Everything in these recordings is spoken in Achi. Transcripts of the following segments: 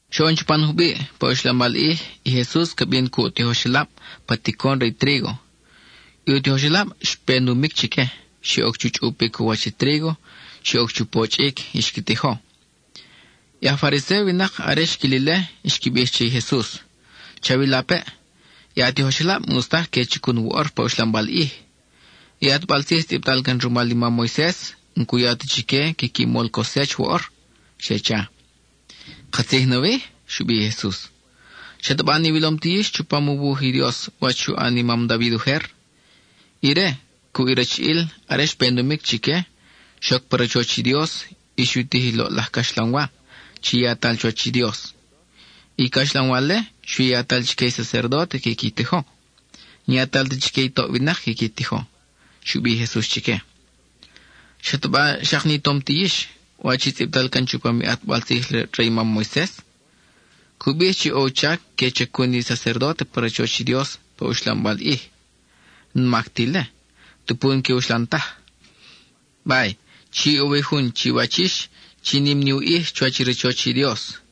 Xoʼon chupan jubiʼ, pa uxlambal ʼij, i Jesus ca bin cuʼ u tijoxelab pa ticon re i trígo. I u tijoxelab, xpe numic chique; xe oc chu chʼupic u wach i trígo; xe oc chu pochʼic, y xqui tijo. I aj Fariséo winak, are xquil ile, xqui bij che i Jesus: —Chawilapeʼ, i a tijoxelab, n-ʼus taj que chacun woʼor pa uxlambal ʼij. I ʼatbal tzij tzʼibtal can rumal i mam Moises n-cu ya ta chique quiqui mol cosech woʼor —xe cha. —¿Katzij nawi? —xu bij i Jesus—. ¿Xataba n-iwilom ti yix chupam u wuj i Dios wach xu ʼan i mam David ujer? Ire, cuʼ i rachiʼil are xpe numic chique, xoc pa rachoch i Dios y xu tij i loʼlaj caxlanwa, chi yatal chuwach i Dios. I caxlanwa-le, xui yatal chique i sacerdóte quiqui tijo; n-yatal ta chique i toʼ winak quiqui tijo —xu bij i Jesus chique. ¿Xataba xak ni tom ti yix wach i tzʼibtal can chupam i ʼatbal tzij re i mam Moises? Cu bij chi ʼo u chac que chacun i sacerdóte pa rachoch i Dios pa uxlambal ʼij. N-mac ta ile, tupu n-que uxlan taj. Bay, chi ʼo wi Jun chiwach yix chi nim ni u ʼij chuwach i rachoch i Dios.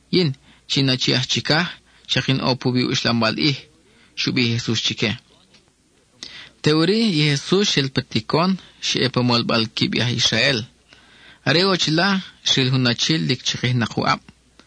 Yin, chi in Achi aj Chicaj xak in ʼo puwi i uxlambal ʼij —xu bij i Jesus chique. Teʼuri i Jesus xel pa ticon, xa ʼe pa molbal quib i aj Israel. Are ʼo chila, xril jun achi lic chakijnak u ʼab.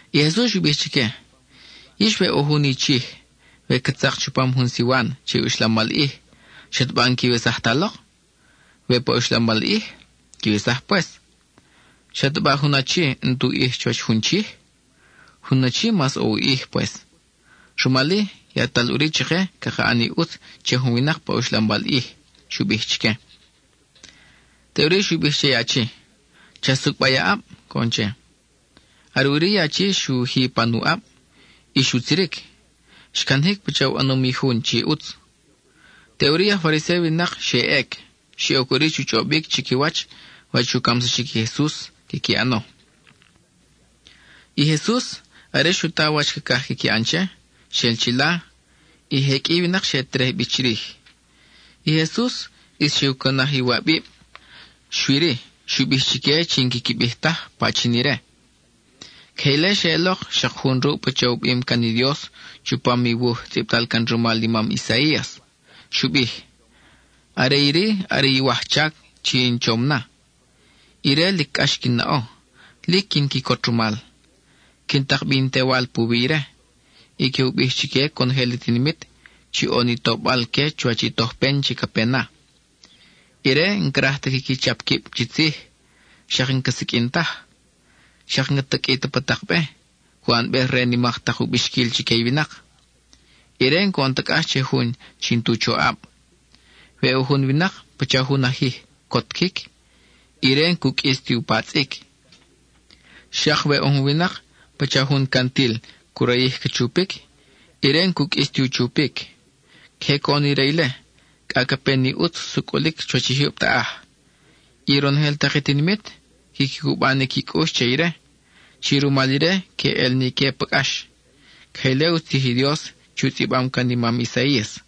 I Jesus xu bij chique: —Yix, we ʼo jun i chij, we ca tzak chupam jun siwan che i uxlambal ʼij, ¿xataba n-quiwesaj ta lok, we pa uxlambal ʼij? Quiwesaj pues. ¿Xataba jun achi n-tu ʼij chuwach jun chij? Jun achi mas ʼo u ʼij pues. Rumal-i, yatal ʼuri chake caka ʼan i ʼutz che jun winak pa uxlambal ʼij —xu bij chique. Teʼuri xu bij che i achi: —Cha sucʼba i a ʼab —coʼon che. Are ʼuri i achi xu ji pan u ʼab, y xutziric; xcanajic pacha u ʼanom i jun chi ʼutz. Teʼuri i aj Fariséo winak xe ʼec; xe oc ʼuri chu chʼobic chiquiwach wach u camsaxic i Jesus quiqui ʼano. I Jesus, are xu ta wach cacaj quiqui ʼan che, xel chila; y je qʼui i winak xe terej bi chirij. I Jesus ʼis xe u cunaj iwabib, xui-ri, xu bij chique chi n-quiqui bij taj pachin ire. Queje ile xeʼelok xak jun ruʼ pacha u bim can i Dios chupam i wuj tzʼibtal can rumal i mam Isaías. Xu bij: Are iri are i wajchac chi in chom na; ire lic cʼax quin naʼo, lic quin quicot rumal. Quin tak bi in Tewal puwi ire, y que u bij chique conojel i tinimit chi ʼo ni tobal-que chuwach i tojpen chi ca pe na. Ire n-craj ta quiqui chap quib chi tzij, xak n-ca siqʼuin taj; xak n-ca taqʼui ta pa tak be, cu ʼanbej re nimak tak u bixquil chique i winak. Ire n-coʼon ta cʼax che jun chi n-tu choʼab: we ʼo jun winak pacha jun ajij cotquic, ire n-cu qʼuis ti u patzʼic; xak we ʼo jun winak pacha jun cantil cu rayij ca chupic, ire n-cu qʼuis ti u chupic. Queje coʼon ire ile, cʼa ca pe ni ʼutz sucʼulic chuwach i jyub taʼaj. I ronojel tak i tinimit, quiqui cuba ni qui cʼux che ire, chi rumal ire que ʼel ni ique pa cʼax. (Queje ile u tzij i Dios chi u tzʼibam can i mam Isaías.)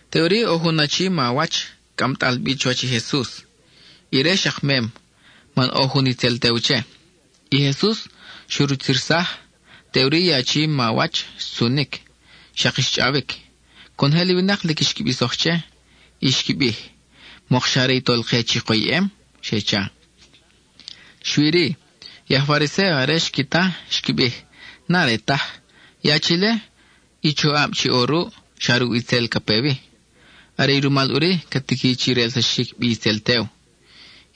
Teʼuri ʼo jun achi mawach, cʼamtal bi chuwach i Jesus. Ire xak mem, man ʼo jun itzel tew che. I Jesus xu rutzirsaj, teʼuri i achi chi mawach xtzunic, xak xchʼawic. Conojel i winak lic xqui bisoj che, y xqui bij: —¿Mokxa are i Tolke chi koyʼem? —xe cha. Xui-ri, i je aj Fariséo are xqui ta, xqui bij: —N-are taj. I achi-le, i choʼab chi ʼo ruʼ xa ruʼ itzel ca pe wi. Are i rumal ʼuri ca tiqui chi relsaxic bi itzel tew.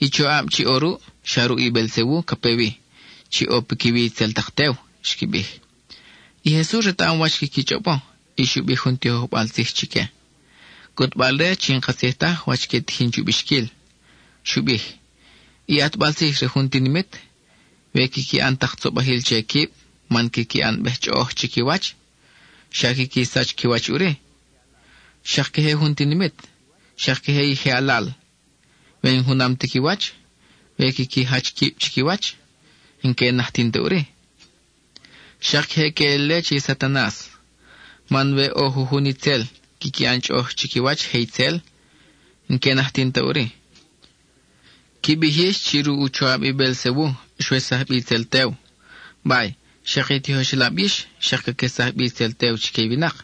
I choʼab chi ʼo ruʼ, xa ruʼ i Beelzebu ca pe wi, chi ʼo piquiwi itzel tak tew —xqui bij. I Jesus retaʼam wach quiqui chʼobo, y xu bij jun tijojbal tzij chique, cʼutbal-re chi n-katzij taj wach que tijin chu bixquil. Xu bij: —I ʼatbal tzij re jun tinimit, we quiqui ʼan tak tzobajil che quib man quiqui ʼanbej chʼoʼoj chiquiwach, xa quiqui sach qui wach ʼuri. Xak queje jun tinimit, xak queje i je alal; we n-junam ti qui wach, we quiqui jach quib chiquiwach, n-que najtin ta ʼuri. Xak queje queʼel ile che i Satanas, man we ʼo jujun itzel quiqui ʼan chʼoʼoj chiquiwach je itzel, n-que najtin ta ʼuri. Qui bij yix chi ruʼ u choʼab i Beelzebu xwesaj bi itzel tew. Bay, xak i tijoxelab yix xak caquesaj bi itzel tew chique i winak;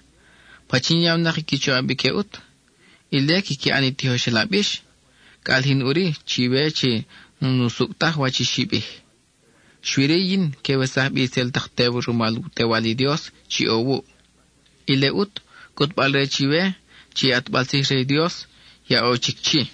¿pachin yawnak i qui choʼab ique ʼut? Ile quiqui ʼan i tijoxelab yix; ca ʼalijin ʼuri chiwe chi n-usucʼ taj wach i xi bij. Xui-ri, yin que wesaj bi itzel tak tew rumal u Tewal i Dios chi ʼo wuʼ. Ile ʼut cʼutbal-re chiwe chi i ʼatbal tzij re i Dios ya ʼo chic chi.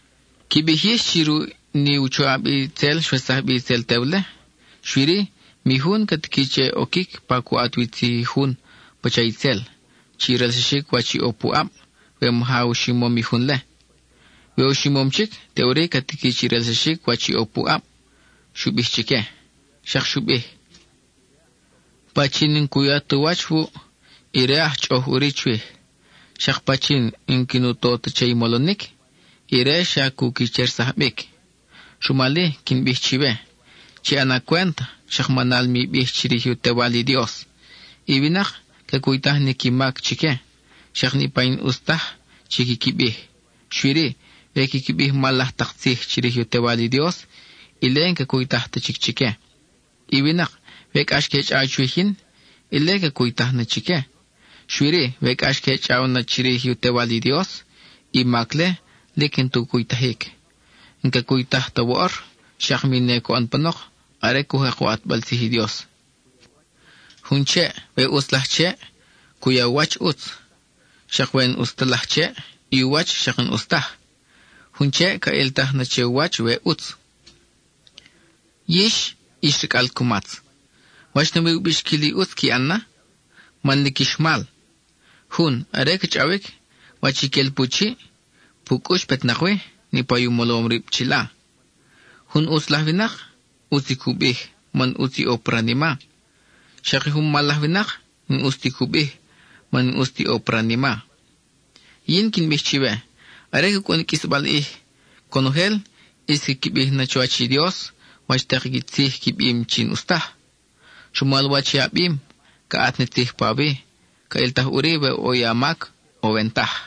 Qui bij yix chi ruʼ ni u choʼab itzel, xwesaj bi itzel tew-le. Xui-ri, mi jun ca tiqui che oquic pa cu ʼat wi tzij jun (pacha itzel), chi relsaxic wach i ʼo puʼab, we maja u ximom i jun-le. We u ximom chic, teʼuri ca tiqui chi relsaxic wach i ʼo puʼab —xu bij chique. Xak xu bij: —Pachin n-cu ya tu wach wuʼ, ire aj chʼoʼoj ʼuri chwij. Xak pachin jun n-quin u to ta che i molonic, ire xa cu quichersaj bic. Rumal-i quin bij chiwe, chi ʼana cwent xak manal mi bij chirij u Tewal i Dios. I winak, ca cuytaj ni qui mac chique, xak niʼpa i n-ʼus taj chi quiqui bij; xui-ri, we quiqui bij mal laj tak tzij chirij u Tewal i Dios, ile n-ca cuytaj ta chic chique. I winak, we cʼax que chʼaw chwij yin, ile ca cuytaj na chique; xui-ri we cʼax que chʼaw na chirij u Tewal i Dios, i mac-le lic n-ta u cuytajic. N-ca cuytaj ta woʼor, xak mi ne coʼon panok, are cu jek u ʼatbal tzij i Dios. Jun cheʼ, we ʼutz laj cheʼ, cu ya u wach ʼutz; xak we n-ʼus ta laj cheʼ, i u wach xak n-ʼus taj. Jun cheʼ ca ʼiltaj na che u wach we ʼutz. ¡Yix ix racʼal cumatz! ¿Wach nawi u bixquil i ʼutz qui ʼan na? man lic ix mal. Jun, are ca chʼawic, wach i quel pu chiʼ, pu cʼux petnak wi, niʼpa u molom rib chila. Jun ʼutz laj winak, ʼutz i cu bij, man ʼutz i ʼo pa ranima; xak jun mal laj winak, n-ʼus ti cu bij, man n-ʼus ti ʼo pa ranima. Y yin quin bij chiwe, are ca cʼun i qʼuisbal ʼij, conojel ʼis quiqui bij na chuwach i Dios wach tak i tzij qui bim chi n-ʼus taj. Rumal wach i a bim, ca ʼat ni tzij pawi, ca ʼiltaj ʼuri we ʼo i a mac, o we n-taj.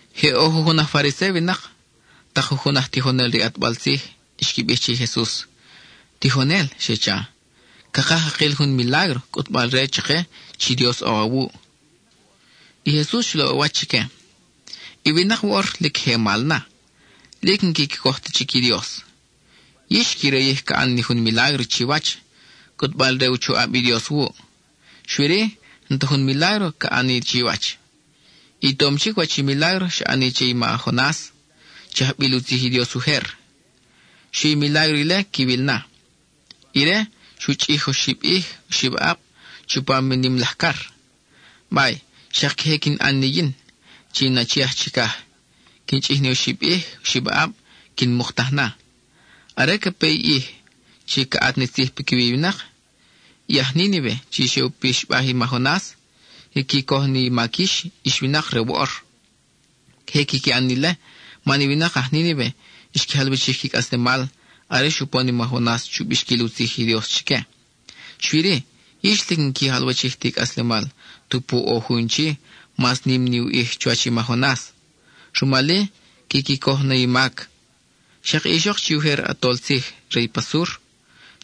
Je ʼo jujun aj Fariséo winak, tak jujun aj tijonel re i ʼatbal tzij, xqui bij che i Jesus: —Tijonel —xe cha—, cakaj cakil jun milágro, cʼutbal-re chake chi Dios ʼo awuʼ. I Jesus xu laʼ u wach chique: —I winak woʼor, lic je mal na, lic n-quiqui coj ta chic i Dios. Yix qui rayij ca ʼan ni jun milágro chiwach, cʼutbal re u choʼab i Dios wuʼ; xui-ri, n-ta jun milágro ca ʼan ni chiwach. I tom chic wach i milágro xa ʼani che i ma Jonas, chi ajbil u tzij i Dios ujer. Xui i milágro-le quiwil na. Ire xu chʼij oxib ʼij, oxib aʼab, chupam i nim laj car; bay, xak queje quin ʼan ni yin, chi in Achi aj Chicaj; quin chʼij ni oxib ʼij, oxib aʼab, quin muktaj na. Are ca pe i ʼij chi ca ʼat ni tzij piquiwi i winak, i aj Nínive chi xe u pixbaj i ma Jonas, quiqui coj na i mac yix ix winak re woʼor. Queje quiqui ʼan ni ile, man i winak aj Nínive xqui jalwachij qui cʼaslemal are xupon i ma Jonas chu bixquil u tzij i Dios chique. Xui-ri, yix lic n-qui jalwachij ti cʼaslemal tupu ʼo Jun chi, mas nim ni u ʼij chuwach i ma Jonas; rumal-i quiqui coj na i mac. Xak i ixok, chi ujer ʼatol tzij re i pa Sur,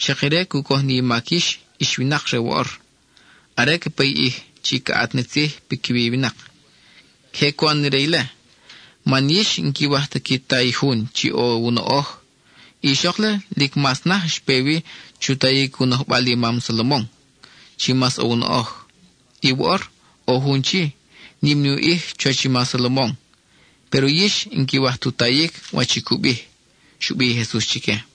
xak ire cu coj ni i mac yix ix winak re woʼor, are ca pe i ʼij chi ca ʼat ni tzij piquiwi i winak. Queje cu ʼan na ire-le, man yix n-quiwaj ta qui ta i Jun chi ʼo u noʼoj. I ixok-le, lic mas naj xpe wi chu tayic u nojbal i ma Salomon, chi mas ʼo u noʼoj. Y woʼor ʼo Jun chi, nim ni u ʼij chuwach i ma Salomon, péro yix n-quiwaj tu tayic wach i cu bij —xu bij i Jesus chique.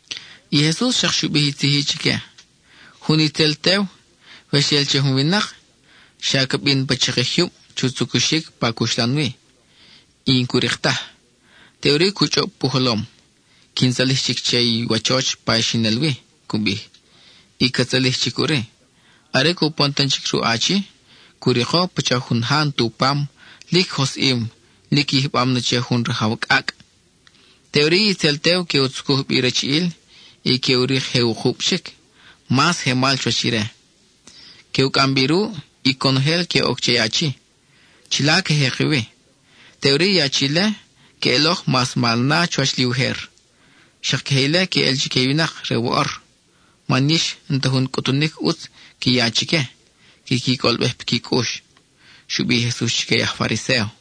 I Jesus xak xu bij i tzij-i chique: —Jun itzel tew, we xel che jun winak, xa ca bin pa chakij jyub chu tzucuxic pa cuxlan wi, y n-cu rik taj. Teʼuri cu chʼob pu jolom: “Quin tzalij chic che i wachoch pa i xin el wi” cu bij; y ca tzalij chic ʼuri. Are cupon tan chic ruʼ achi, cu riko pacha jun ja n-tu pam, lic josʼim, lic yijbam na che jun rajaw cʼacʼ. Teʼuri i itzel tew que u tzucuj bi rachiʼil, y que u rik je wukub chic, mas je mal chuwach ire. Que u cʼam bi ruʼ, y conojel que oc che achi. Chila que jeki wi. Teʼuri i achi-le, queʼelok mas mal na chuwach li ujer. Xak queje ile queʼel chique i winak re woʼor (man yix n-ta jun cʼutunic ʼutz qui ya chique, quiqui cʼolbej piqui cʼux —xu bij i Jesus chique i aj Fariséo).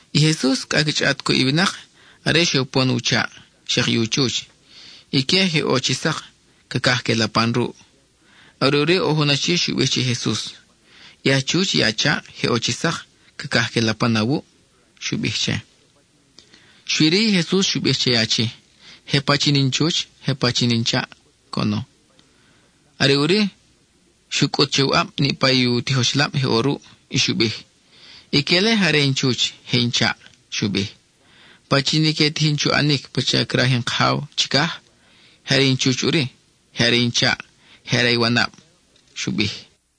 I Jesus cʼa ca chʼaʼat cuʼ i winak are xe upon u chaʼ, xak i u chuch. Ique je ʼo chi sak, cacaj que lapan ruʼ. Are ʼuri ʼo jun achi xu bij che i Jesus: —I a chuch cuʼ i a chaʼ je ʼo chi sak, cacaj que lapan awuʼ —xu bij che. Xui-ri, i Jesus xu bij che i achi: —¿Je pachin in chuch, je pachin in chaʼ? —coʼono. Are ʼuri, xu cʼut che u ʼab niʼpa i u tijoxelab je ʼo ruʼ, y xu bij: —Ique-le je are in chuch, je in chaʼ —xu bij—. Pachin i que tijin chu ʼanic pacha craj in Kajaw chicaj, je are in chuch ʼuri, je are in chaʼ, je are i wanab —xu bij.